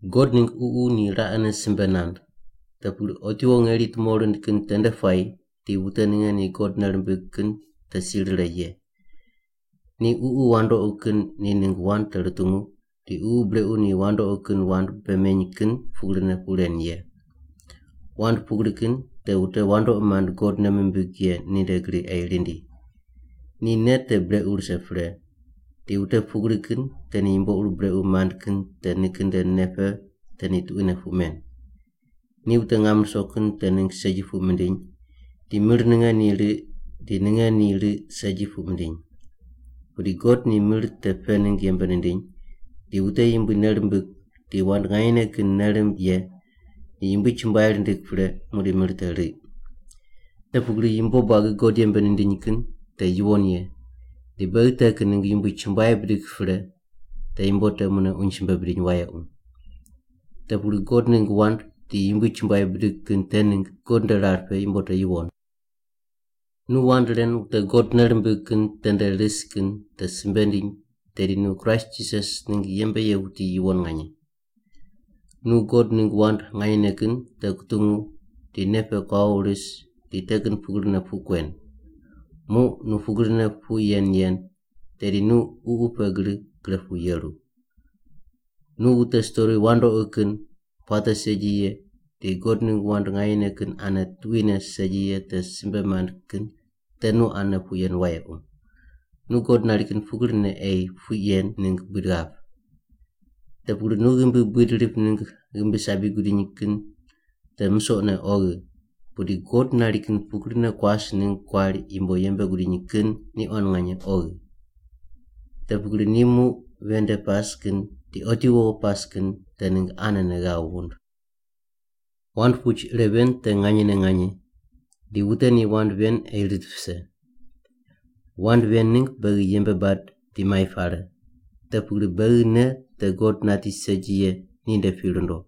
God ningg Ququ ni raqene simbe nand, te pugri otiwo ngeri tumo rind kin tende puayi di wute ninge ni God nei rimbig kin te si rire ye. Ni ququ wandoqi kin ni ningg wand te rutungu di ququ brequ ni wandoqi kin wand bei meny kin pugrine puq ren ye. Wand pugri kin te wute wandoqi mand God nei mimbig ye ninde gri ei rindi. Ni nei te brequ rise pre, di wute pugri kin te ni yumbo ur brequ mand kin te nikin nde nei pe te ni tuquine puq men. Ni wute ngam ruso kin te ningg segi puq mindiny di mir ninge ni riq di ninge ni riq segi puq mindiny. Pudi God ni mir te pe ningg yembe nindiny, di wute Yumbui nei rimbig di wand nganyene kin nei rimb ye ni Yumbui chumbuai rindig pre muqdi mir te riq. Te pugri yumbo buagi God yembe nindiny kin te yuwon ye, di beghi te kin ningg Yumbui chumbuai bidig pre te yumbo te mune uny simbe bidiny wayequ. Te pugri God ningg wand di Yumbui chumbuai bidig kin te ningg God nde rar pe yumbo te yuwon. Nu wand ren wute God nei rimbig kin tende ris kin te simbe ndiny tedi nu Kraist Jisas ningg yembe ye wuti yuwon nganye. Nu God ningg wand nganyene kin te kutungu di nei pe kuawo ris di te kin pugrine puq kuen. Muq nu pugrine puq yen yen, tedi nu ququ pe gri gre pu yeru. Nu wute stori wandoqi kin puate segi ye di God ningg wand nganyene kin ane tuquine segi ye te simbe mand kin te nu ane puq yen wayequ. Nu God nari kin pugrine ei puq yen ningg buid ghap. Te pugri nu ghimbi buid rip ningg ghimbi sabi gudiny kin te musoqne oghi, pudi God nari kin pugrine kuas ningg kuari yumbo yembe gudiny kin ni quan nganye oghi. Te pugri ni muq ven nde pas kin di otiwo pas kin te ningg anene ghav wund. Wand puch ire ven te nganyene nganye, di wute ni wand ven ei rit vise. Wand ven ningg beghi yembe bad di mai pare, te pugri beghi nei te God nati segi ye ninde pi rundo.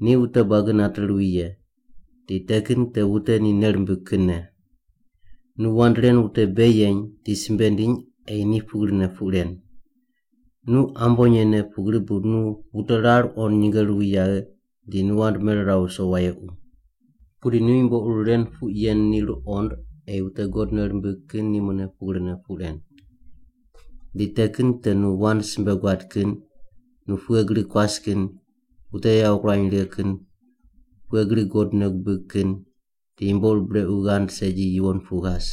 Ni wute buagi nate ruwi ye, di te kin te wute ni nei rimbig kinne. Nu wand ren wute bei yeny di simbe ndiny ei ni pugrine puq ren. Nu ambonye ne pugri bu nu wute rar qond nyinge ruwi yaghe di nu wand meriraw viso wayequ. Pudi nu yumbo ur ren puq yen ni ruqond ei wute God nei rimbig kin ni mune pugrine puq ren. Di te kin te nu wand simbe guad kin, nu pughe gri kuas kin, wute yawo kurany righe kin, pughe gri God nei gubig kin, di yumbo ur brequ ghand segi yuwon pu ghas.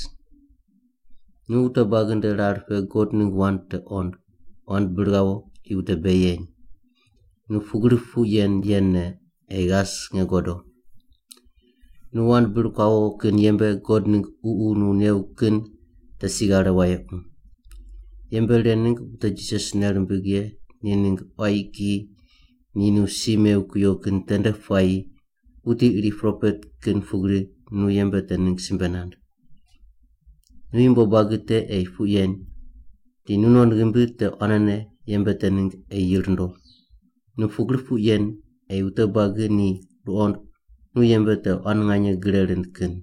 Nu wute buagi nde rar pe God ningg wand te qond, wand bir ghawo di wute bei yeny. Nu pugri puq yen yenne ei ghas nge godo. Nu wand bir kuawo kin yembe God ningg Ququ nu new kin te si ghare wayequ. Yembe ren ningg wute Jisas nei rimbig ye ni ningg quayi kiyi ni nu si mew kuyo kin tende puayi wuti iri propet kin pugri nu yembe te ningg simbe nand. Nu yumbo buagi te ei puq yen di nu non ghimbi te quanene yembe te ningg ei yi rundo. Nu pugri puq yen ei wute buagi ni ruqond nu yembe te quan nganye gre rind kin.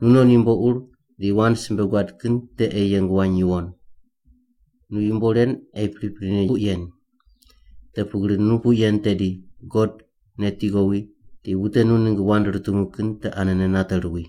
Nunon yumbo ur di wand simbe guad kin te ei yeng wany yuwon. Nu yumbo ren ei priprine puq yen, te pugri nu puq yen tedi God nu neti ghowi di wute nu ningg wand rutungu kin te anene nate ruwi.